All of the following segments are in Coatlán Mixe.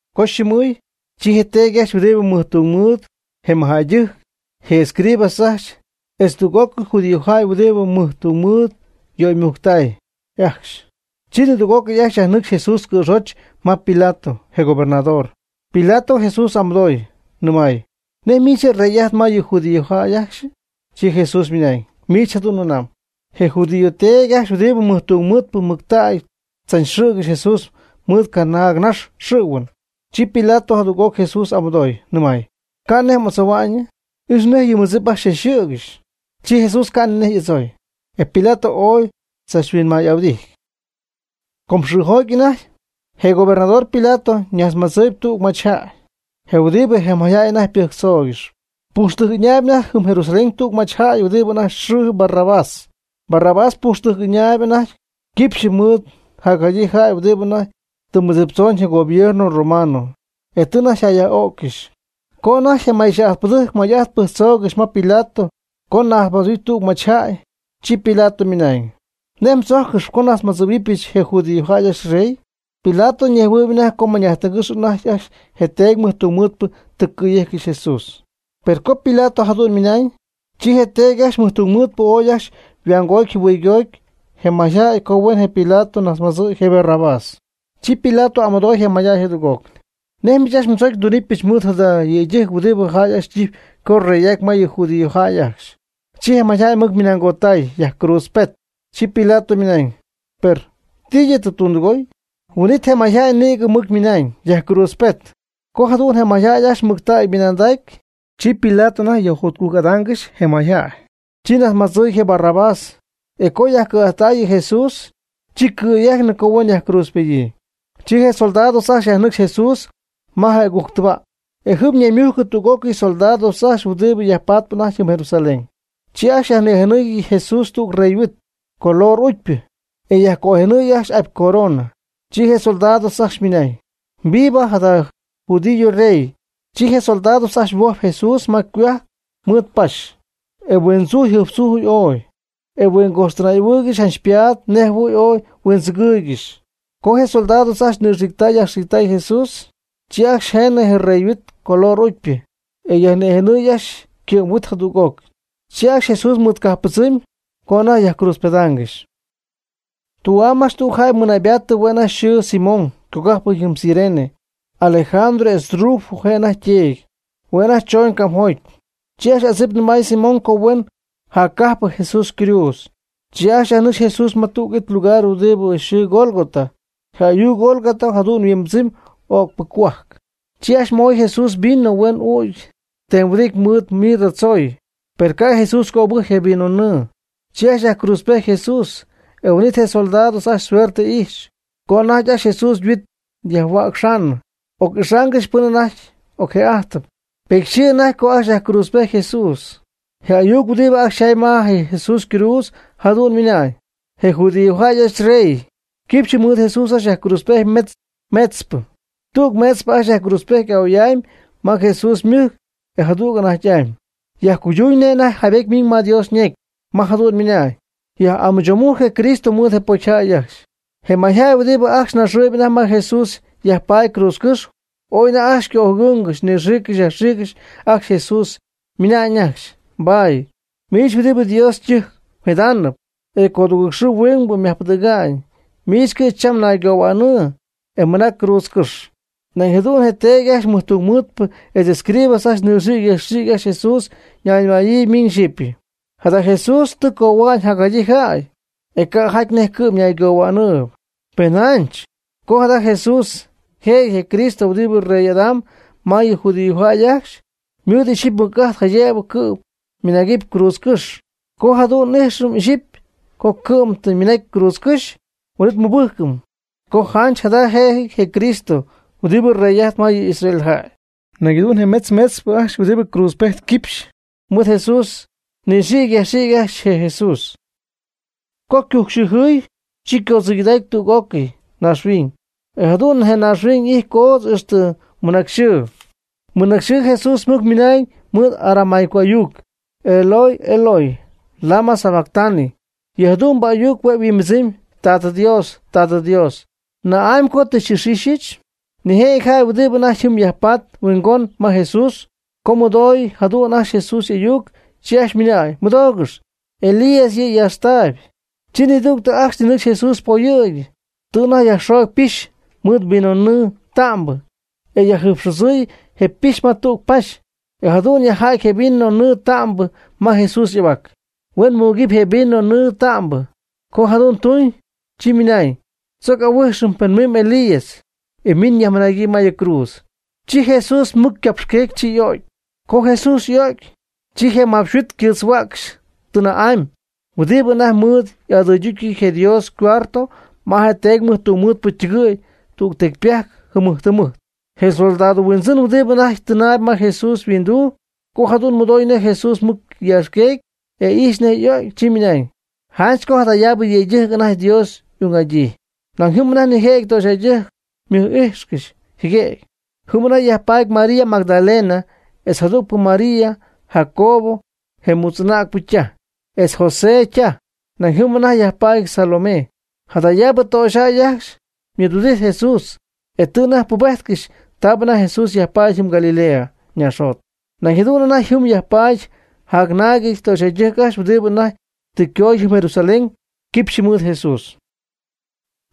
Co yxɨmɨɨy, chi je teedy ajcxy huɨdibɨ mɨj tung mɨɨd, je mɨjjäydɨjc, je escribas ajcxy, etz tüg'ócɨy judíojäy huɨdibɨ mɨj tung mɨɨd yöymujctay ajcxy. Chi nidüg'ócɨy ajcxy yajnɨ́cxcɨxy Jesús cɨ̈xoch ma Pilato, je gobernador. Pilato Jesús y'amɨdooy, nɨmay: ―¿Nej miich rey'ajtp ma yɨ judíojäy ajcxyɨ? Chi Jesús ymɨnañ: ―Miich jadu'n mɨnamb. Je judío teedy ajcxy huɨdibɨ mɨjtungmɨɨdpɨ mɨctägy tzachxɨ̈gɨxy Jesús mɨɨd canaagnax xɨ̈huɨn. Chi Pilato jadüg'oc Jesús y'amɨdooy, nɨmay: ―¿Ca' nej m'adzohua'ñɨ? Ix nej yɨ mmɨdzip ajcxy xychachxɨ̈gɨxy. Chi Jesús ca' ni nej y'adzooy. E Pilato ooy chachhuinmay'ahuɨdijty. Com xɨɨjoty anajty, je gobernador Pilato najtzmadzɨɨy tüg machyjäy, je huɨdibɨ je mayjäy anajty ypɨjctzoogɨxyp. Pujxtɨjc ɨñaayb anajty jɨm Jerusalén tüg machyjäy huɨdibɨ anajty yxɨɨ Barrabás. Barrabás pujxtɨjc ɨñaayb anajty quipxy mɨɨd jacjadyii jäy huɨdibɨ anajty tɨ mɨdziptzoon je gobierno romano, e tɨ anajty yjäyyaj'ó'ccɨxy. Co anajty je may yxɨɨ'ajtpɨdɨjc may'ajt pɨjctzoogɨxy ma Pilato co najtzmadzɨ̈huɨp tüg machyjäy, chi Pilato ymɨnañ: ―¿Nej mdzojccɨxyp co nnajtzmadzɨ̈huɨbɨch je judíojäy ajcxy yrey? Pilato ñejhuɨɨyb anajty co mañ'ajtɨngɨ́xy anajty ajcxy je teedy mɨjtungmɨɨdpɨ tɨ cɨ̈yejccɨxy Jesús. Per co Pilato jadu'n ymɨnañ, chi je teedy ajcxy mɨjtungmɨɨdpɨ ooy ajcxy yajhuamgoty yajjɨhuɨygoty je mayjäy co huen je Pilato najtzmadzɨ̈y je Barrabás. Chi Pilato y'amɨdooy je mayjäy jadüg'oc: ―¿Nej miich ajcxy mdzocy ndunɨpyɨch mɨɨd jada yëydɨjc huɨdibɨ jäy ajcxy ytijpy co yrey'aty ma yɨ judíojäy ajcxy? Chi je mayjäy mɨc ymɨnangottay: ―Yajcruutzpet. Chi Pilato ymɨnañ: ―Per ¿ti yɨ' tɨ tundɨgoy? Huin'it je mayjäy nïgɨ mɨc ymɨnañ: ―¡Yajcruutzpet! Co jadu'n je mayjäy ajcxy mɨctägy ymɨnanday, chi Pilato anajty yajjotcujc'adaangɨxy je mayjäy, chi najtzmadzɨɨy je Barrabás. E co yajcɨ̈'ajttay yɨ Jesús, chi cɨ̈yejcnɨ co huen yajcruutzpedyii. Chi je soldados ajcxy yajnɨcxy Jesús ma je agujctɨjc tɨba', e jɨm ñaymujcɨ tüg'ócɨy soldados ajcxy huɨdibɨ yajpatp anajty jɨm Jerusalén. Chi ajcxy yajnïjenɨɨy je Jesús tüg rey yhuit, color ucypɨ e yajcojenɨɨy ajcxy apy corona. Chi je soldados ajcxy ymɨnañ: ―¡Viva jada judío rey! Chi je soldados ajcxy huojpy Jesús ma ycohuajc mɨɨd paxy, e huindzuj jɨjptzujcɨxy ooy, e huingojxtɨnay'ahuɨɨygɨxy janch ypaad nej jɨhuɨ̈y ooy huindzɨgɨɨygɨxy. Co je soldados ajcxy nɨxiictay yajxiictay Jesús, chi ajcxy jeenɨ je yreyhuit color ucypɨ, e yajnïjenɨɨy ajcxy ycɨ'm yhuit jadüg'oc. Chi ajcxy Jesús mɨɨdcajppɨdzɨmy co anajty yajcruutzpedaangɨxy. Tü'am ajcxy tüg jäy mɨɨdnaybatɨ, hue' anajty yxɨɨ, Simón, ycogájpɨty jɨm Cirene, Alejandro etz Rufo je' anajty yteedy. Hue' anajty choñ camjoty. Chi ajcxy adzip nɨmay Simón co huen jaccajpɨ Jesús ycruudz. Chi ajcxy yajnɨcxy Jesús ma tüg it lugar huɨdibɨ yxɨɨ Gólgota, je ayuc Gólgota jadu'n yhuimbɨdzɨmy o'cpɨ cohuajc. Chi ajcxy moy Jesús vino huen ügy tem huɨdity mɨɨd mirra tzoy. Per ca' Jesús cöbɨjcy je vino nɨɨ. Chi ajcxy yajcruutzpejty Jesús. E huin'it je soldados ajcxy suerte ijxy, co anajty ajcxy Jesús yhuit yajhuäcxaanɨ, oc'ixaangɨxy pɨn anajty ocjë'ájtɨp. Petyxɨɨ anajty co ajcxy yajcruutzpejty Jesús. Je ayuc huɨdibɨ ajcxy yjaay ma Jesús cruudz, jadu'n ymɨnañ: ―Je judíojäy ajcxy yRey. Quipxy mɨɨd Jesús ajcxy yajcruutzpejty metz meetzpɨ. Tüg meetzpɨ ajcxy yajcruutzpejty a'oy'amy ma Jesús ymɨjc, e jadüg anajty'amy. Yajcuyduñ nej anajty jaybety miñ ma Dios ñecy, ma jadu'n ymɨnañ: “Yaj'amɨchoomujc je Cristo mɨɨd je pocyjäy ajcxy.” Je mayjäy huɨdibɨ ajcxy naxɨɨyb anajty ma Jesús yajpaady cruutzcɨ́xy, ooy anajty ajcxy ycöjɨgɨɨyñ, nɨxiicy yajxiicy ajcxy Jesús, ymɨnañ ajcxy: ―Bah, miich huɨdibɨ Dios ytɨjc mjidaanɨp, e codugɨɨg xɨɨ huingbɨ myajpɨdɨ̈ga'ñ, miich cɨ'm cham naygohuaanɨ, e mɨnac cruutzcɨ́xy. Nañ jadu'n je teedy ajcxy mɨjtungmɨɨdpɨ etz je escribas ajcxy nɨxiicy yajxiicy ajcxy Jesús ñayñɨmayɨ miñ xyɨpy: ―Jada Jesús tɨ cohua'ñ jacjadyii jäy, e ca' jaty nej cɨ'm ñaygohua'nɨɨyb. Pen janch, co jada Jesús yjëjɨty je Cristo huɨdibɨ rey'adamb ma yɨ judíojäy ajcxy, ymɨɨd ixyipy mɨc'ajt jaydëb cɨ'm ymɨnagɨpy cruutzcɨ́xy. Co jadu'n ixyipy n'íjxɨm co cɨ'm tɨ ymɨnacy cruutzcɨ́xy, huin'it mɨbɨ́jcɨm co janch jada jëjɨty je Cristo huɨdibɨ rey'ajtp ma yɨ Israel jäy. Nañ jadu'n je metz meetzpɨ ajcxy huɨdibɨ cruutzpejt quipxy mɨɨd Jesús nɨxiicy yajxiicy ajcxy je Jesús. Co ycujcxɨɨjɨɨy, chi ycoodzɨygɨday tüg'ócɨy naaxhuiñ. E jadu'n je naaxhuiñ y'ijty coodz ixtɨ mɨnacyxɨɨ. Mɨnacyxɨɨ Jesús mɨc ymɨnañ mɨɨd aramaico ayuc: ―Eloi, Eloi, ¿lama sabactani? ―yɨ jadu'mbɨ ayuc hue' yhuimbɨdzɨmy: Tat Dios. Tat Dios. ¿Na'amy co tɨ xy'ix'ixyɨch? Nijëjɨty jäy huɨdibɨ anajty jɨm yajpatp huingon ma Jesús, co mɨdoo jadu'n ajcxy Jesús y'ayuc, chi ajcxy ymɨnañ: ―Mɨdoogɨx, Elías yɨ' yaaxtaayb. Chi nidügtɨ ajcxy ninɨcxy Jesús poyɨ̈gy, tɨ anajty yajxoogy pixy mɨɨd vinonɨɨ ta'mbɨ, e yajjɨjpxodzɨɨy je pixy ma tüg paxy, e jadu'n yajja'ty je vino nɨɨ ta'mbɨ ma Jesús y'ahuac, huen muucɨp je vino nɨɨ ta'mbɨ. Co jadu'n tuñ, chi ymɨnañ: ―Tzoc oc'ahuíjxɨm pen mimb Elías, e miñ yajmɨnagyii ma yɨ cruudz. Chi Jesús mɨc ycapxqueegy, chi y'o'cy. Co Jesús y'o'cy, chi je mapxhuit ycɨɨtzhua'cxy tɨnä'amy huɨdibɨ anajty mɨɨd y'adɨydútyɨty je Dios ycuarto ma je teedy mɨjtungmɨɨdpɨ ytɨgɨ̈y tüg tecypajc jɨmɨjt jɨmɨjt. Je soldado huindzɨn huɨdibɨ anajty tɨnaayb ma Jesús yhuinduu, co jadu'n mɨdoy nej Jesús mɨc yaaxqueegy, e ijxy nej y'ögy, chi ymɨnañ: ―Janch co jadayaabɨ yëydɨjc anajty Dios ung'adyii. Nañ jɨm anajty nijëjɨty töxyjäydɨjc ymɨj'íjxcɨxy jɨguëgy. Jɨm anajty yajpaady María Magdalena, etz je jadügpɨ María, Jacobo je mutz'anägnɨp ytaj, etz José ytaj. Nañ jɨm anajty yajpaady Salomé. Jadayaabɨ töxyjäy ajcxy mɨɨdhuɨdijt Jesús, e tɨ anajty pubéjtcɨxy taabɨ anajty Jesús yajpaady jɨm Galilea ñaaxjot. Nañ jadu'n anajty jɨm yajpaady jacnaagɨty töxyjäydɨjc ajcxy huɨdibɨ anajty tɨ ycoody jɨm Jerusalén quipxy mɨɨd Jesús.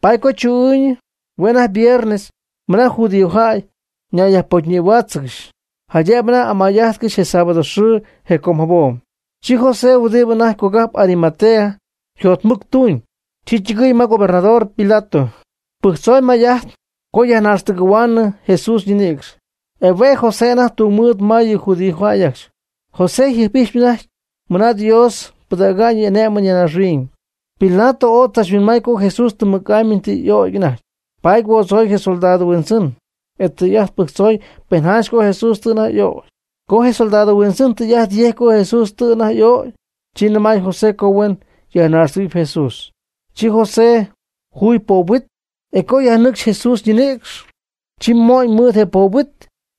Paady co chu'ɨɨyñɨ hue' anajty viernes mɨna judíojäy ñayyajpocyñïhuáatzɨgɨxy, jaydëb anajty amay'adaangɨxy je sábado xɨɨ je com jabom. Chi José huɨdibɨ anajty cogajp Arimatea yjotmɨctuñ, chi ytɨgɨɨy ma je gobernador Pilato, pɨjctzooy may'ajt co yajnaaxtɨgɨ̈huaanɨ Jesús ñinïcx. E hue' je' José anajty tungmɨɨd ma yɨ judíojäy ajcxy. José yjɨjp'ijxpy anajty mɨna Dios pɨdäga'ñ yɨ' y'ané'mɨn ya naaxhuiñ. Pilato ooy tzachhuinmay co Jesús tɨm mɨc'amy tɨ y'ögy anajty, paady huoodzoy je soldado huindzɨn, e tɨy'ajt pɨjctzoy pen janch co Jesús tɨ anajty y'ögy. Co je soldado huindzɨn tɨy'ajt yejcy co Jesús tɨ anajty y'ögy, chi nɨmay José co huen yajnaxtɨgɨ̈huɨpy Jesús. Chi José juy poob huit, e co yajmɨnajcy Jesús ñinïcx, chi mo'ñ mɨɨd je poob huit,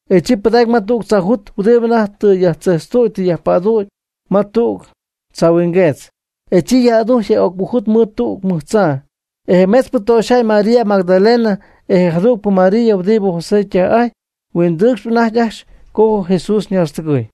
e chi pɨdacy ma tüg tzaajut huɨdibɨ anajty tɨ yajtzejtztüdy tɨ yajpadüdy ma tüg tzaahuingueetz. E chi yaj'adujcy je öcpɨ jut mɨɨd tüg mɨj tzaa. E je metzpɨ töxyjäy María Magdalena etz je jadügpɨ María huɨdibɨ José ytaj'ajtpy huindɨɨcxp anajty ajcxy co Jesús ñaaxtɨgɨɨy.